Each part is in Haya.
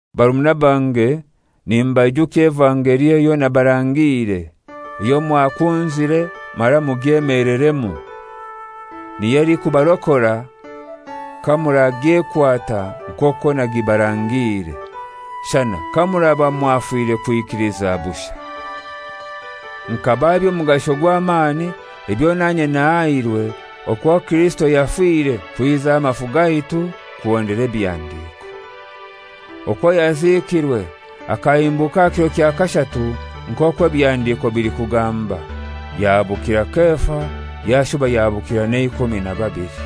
Barumuna bange, nimbaijukya evangeli eyo nabarangiire, eyo mwakunzire mara mugyemeleremu, niyo elikubarokora kamuragyekwata nk'okwo nagibarangiire, shana kamuraba mwafire kwikiliza bushai. Nkabaha eby'omugasho gw'amani ebyo nanye nahairwe, okwo Kirisito yafire kwiza amafu gaitu kuhondera ebihandiko; okwo yaziikirwe, akahimbuka aha kiro kya kashatu nk'okwo ebihandiiko bilikugamba, yahabukira Kefa yashuba yahabukira n'eikumi na babili.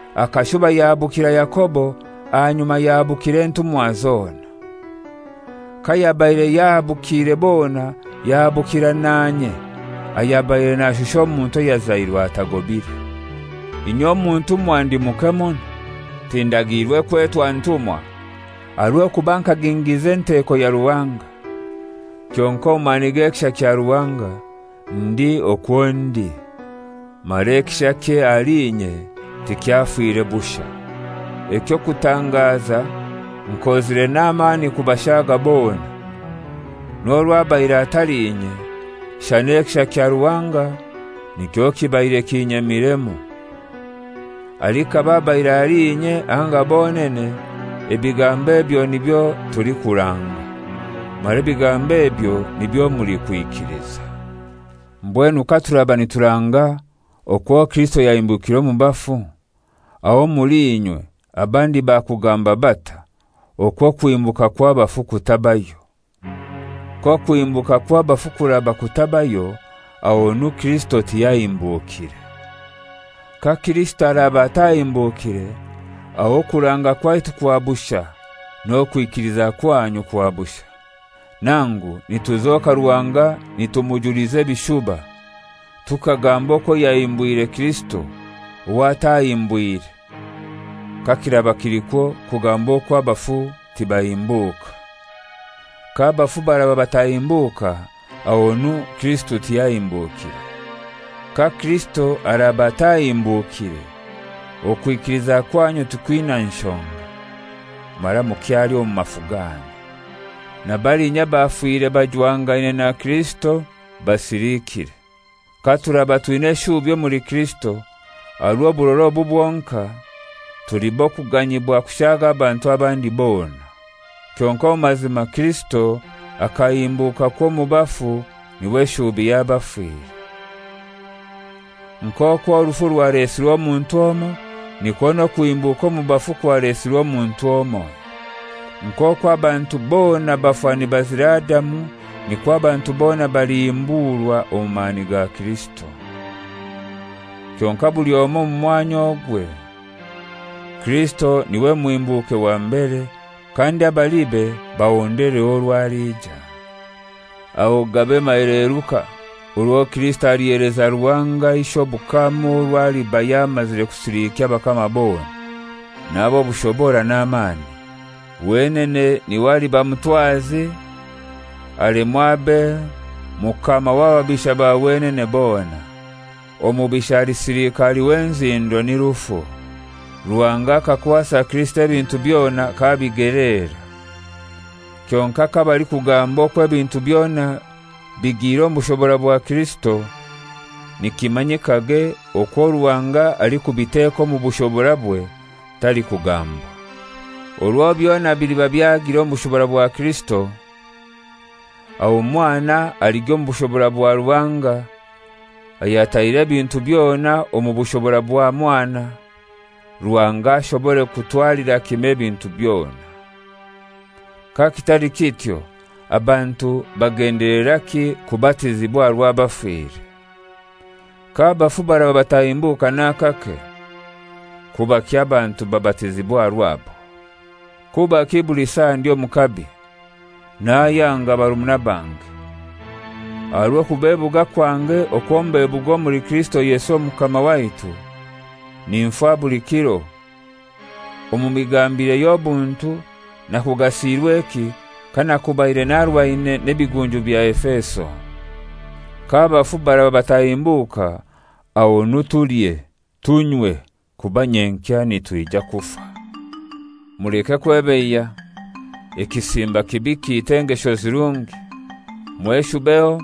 Akashuba yahabukira Yakobo, ahanyuma yahabukira entumwa zona. Kayabaire yahabukiire bona yahabukira nanye, ayabaire nashusha omuntu ayazairwe atagobire. Inye omu ntumwa ndi muke muno, tindagiirwe kwetwa ntumwa, aha rw'okuba nkagingiza enteko ya Ruhanga. Kyonkai omu mani g'ekisha kya Ruhanga ndi okwo ndi, mara ekishakye ahali inye tikyafire bushai. Eky'okutangaza nkozire n'amani kubashaaga bona, n'orwo abaire atali inye, shana ekisha kya Ruhanga nikyo kibaire kinyemiremu. Alikaba abaire ali inye anga bonene, ebigambo ebyo nibyo tulikuranga, mara ebigambo ebyo nibyo mulikwikiliza. Mbwenu katuraba nituranga okwo Kirisito yahimbukire omu bafu, aho omuli inywe abandi bakugamba batai okwo okuhimbuka kw'abafu kutabayo? K'okuhimbuka kw'abafu kuraba kutabayo, ahonu Kirisito tiyahimbukire. Ka Kirisito araba atahimbukire, aho okuranga kwaitu kwa bushai, n'okwikiliza kwanyu kwa bushai. Nangu nituzoka Ruhanga nitumujuliza ebishuba, tukagamba okwo yahimbwire Kirisito, owo atahimbwire kakiraba kilikwo kugamba okwo abafu tibahimbuka. K'abafu baraba batahimbuka ahonu Kirisito tiyahimbukire. Ka Kirisito araba atahimbukire, okwikiliza kwanyu tikwina nshonga, mara mukyali omu mafu ganyu. Na balinya abafire bajwangaine na Kirisito basilikire. Katuraba twina eshuubi omuli Kirisito aha rw'oburora obu bwonkai, tuli b'okuganyibwa kushaaga abantu abandi bona. Kyonkai omu mazima Kirisito akahimbukakwo omu bafu, n'iwe shuubi y'abafire. Nk'okwo orufu rwalesirwe omuntu omoi, nikwo n'okuhimbuka omu bafu kwalesirwe omuntu omoi. Nk'okwo abantu bona bafa nibazira Adamu, nikwo abantu bona balihimburwa omu mani ga Kirisito. Kyonkai buli omoi omu mwanya ogwe: Kirisito n'iwe muhimbuke wa mbere, kandi abalibe bahondereho orwo aliija. Aho gabe maheleruka orwo Kirisito aliheleza Ruhanga Ishe obukama orwo aliba yamazire kusilikya abakama bona, n'ab'obushobora n'amani. Wenene n'iwe aliba mutwazi alemwe abe mukama w'ababisha ba wenene bona. Omubisha alisilika ali w'enzindo ni rufu. Ruhanga akakwasa Kirisito ebintu byona k'abigeleera. Kyonkai kabalikugamba okwo ebintu byona bigire omu bushobora bwa Kirisito, nikimanyikage okwo Ruhanga alikubiteka omu bushoborabwe talikugambwa. Orwo byona biliba byagiire omu bushobora bwa Kirisito, aho Mwana aligya omu bushobora bwa Ruhanga, ayataire ebintu byona omu bushobora bwa Mwana, Ruhanga ashobore kutwalira kimoi ebintu byona. Kakitali kityo abantu bagendeleraki kubatizibwa aha rw'abafire? K'abafu baraba batahimbuka n'akake, kubaki abantu babatizibwa aha rwabo? Kubaki buli saa ndi omu kabi? Nayanga, barumuna bange: Aha rw'okubebuga kwange okwo mbebuga omuli Kirisito Yesu Omukama waitu, ninfa buli kiro! Omu migambire y'obuntu nakugasiirweki kanakubaire narwaine n'ebigunju bya Efeso? K'abafu baraba batahimbuka ahonu tulye, tunywe, kuba nyenkya nitwija kufa. Muleke kwebeiya: Ekisimba kibi kiita engesho zirungi. Mweshubeho,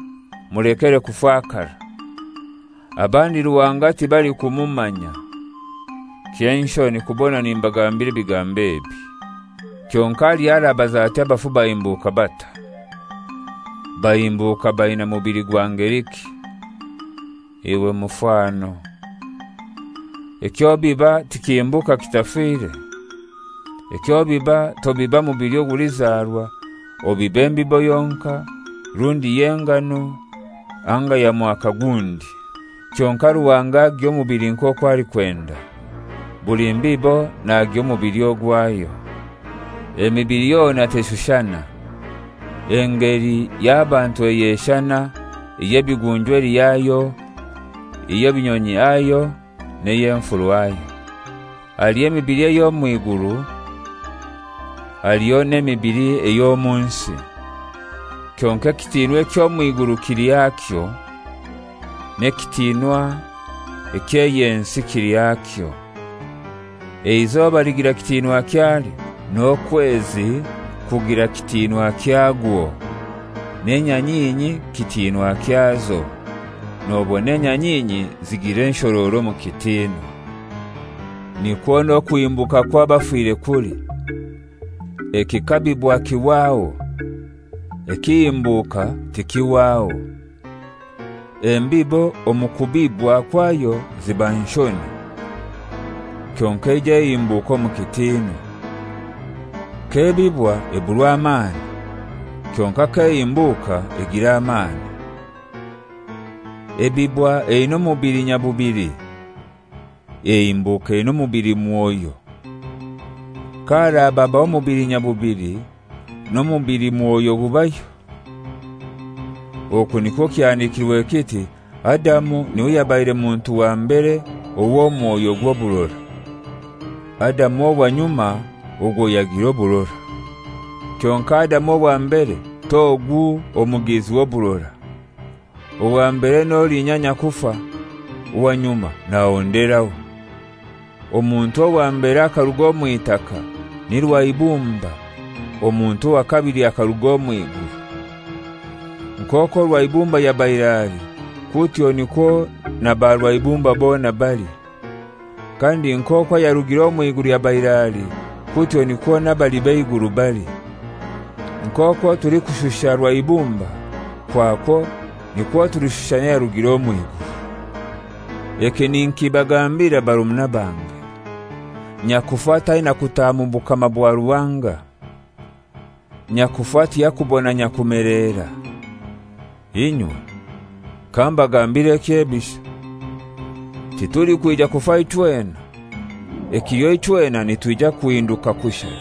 mulekere kufakara. Abandi Ruhanga tibalikumumanya. Ky'enshoni kubona nimbagambira ebigambo ebi. Kyonkai haliho arabaza ati, «Abafu bahimbuka batai? Bahimbuka baina mubili gwa ngeliki?» Iwe mufano! Eky'obiba tikihimbuka kitafire. Eky'obiba tobiba mubili ogulizarwa, obiba embibo yonkai, rundi y'engano anga ya mwaka gundi. Kyonkai Ruhanga agiha omubili nk'okwo alikwenda. Buli mbibo nagiha omubili ogwayo. Emibili yona teshushana. Engeli y'abantu eyeshana, ey'ebigunju eli hayo, ey'ebinyonyi hayo, n'ey'enfuru hayo. Haliho emibili ey'omw'iguru, haliho n'emibili ey'omu nsi. Kyonkai ekitinwa eky'ey'omw'iguru kili hakyo, n'ekitiinwa eky'ey'ensi kili hakyo. Eizoba ligira kitinwa kyalyo, n'okwezi kugira kitinwa wakwo, n'enyanyinyi kitinwa kyazo; nobona enyanyinyi zigira enshororo omu kitinwa. Nikwo n'okuhimbuka kw'abafire kuli. Ekikabibwa kihwaho, ekihimbuka tikihwaho. Embibo omu kubibwa kwayo ziba nshoni, kyonkai eija ehimbuka omu kitinwa. K'ebibwa eburwa amani, kyonkai k'ehimbuka egira amani. Ebibwa eina omubili nyabubili, ehimbuka eina omubilimwoyo. Ka haraba habaho omubili nyabubili, n'omubilimwoyo gubayo. Oku nikwo kyahandikirwe, kiti, «Adamu n'iwe yabaire muntu wa mbere ow'omwoyo gw'oburora;» Adamu owa nyuma ogwo yagira oburora. Kyonkai Adamu owa mbere t'ogu omugizi w'oburora. Owa mbere n'olinya nyakufa, owa nyuma n'ahonderaho. Omuntu owa mbere akaruga omw'itaka, ni rwaibumba; omuntu owa kabili akaruga omw'iguru. Nk'okwo rwaibumba yabaire ali, kutyo nikwo na barwaibumba bona bali. Kandi nk'okwo ayarugire omw'iguru yabaire ali, kutyo nikwo n'abali b'eiguru bali. Nk'okwo tulikushusha rwaibumba, kwakwo nikwo tulishusha n'ayarugire omw'iguru. Eki ninkibagambira barumuna bange: Nyakufa taina kutaaha mu bukama bwa Ruhanga; nyakufa tiyakubona nyakumeleera. Inywe! Kambagambire ekyebisho. Titulikwija kufa ichwena; ekiliho ichwena nitwija kuhinduka kushai,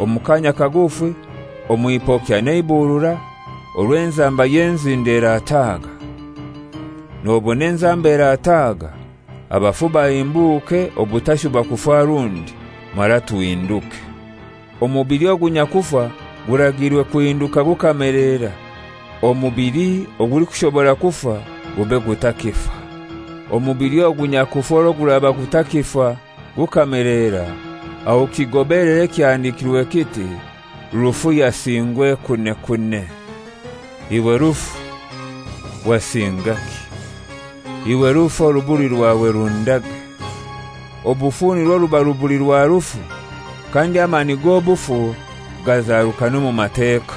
omu kaanya kagufi, omw'ipokya n'eiburura, orwo enzamba y'enzindo erataaga. Nobona enzamba erataaga, abafu bahimbuke obutashuba kufa rundi, mara tuhinduke. Omubili ogu nyakufa guragiirwe kuhinduka gukameleera; omubili ogulikushobora kufa gube gutakifa. Omubili ogu nyakufa orwo guraba gutakifa gukamelera, aho kigobelere ekyahandikirwe kiti: «Rufu yasingwa ekunekune. Iwe rufu, wasingaki? Iwe rufu, orubuli rwawe rundage!» Obufu nirwo ruba rubuli rwa rufu; kandi amani g'obufu gazarukana omu Mateka.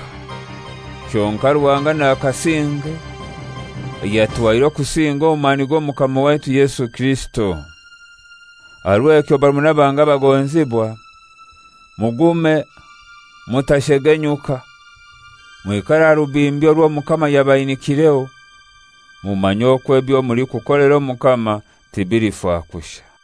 Kyonkai Ruhanga nakasinge ayatuhaire okusinga omu mani g'Omukama waitu Yesu Kirisito. Aha rw'ekyo barumuna bange abagonzibwa, mugume, mutashegenyuka, mwikare aha rubimbi orw'Omukama yabainikireho, mumanye okwo ebyo mulikukolera Omukama bitalifa kushai.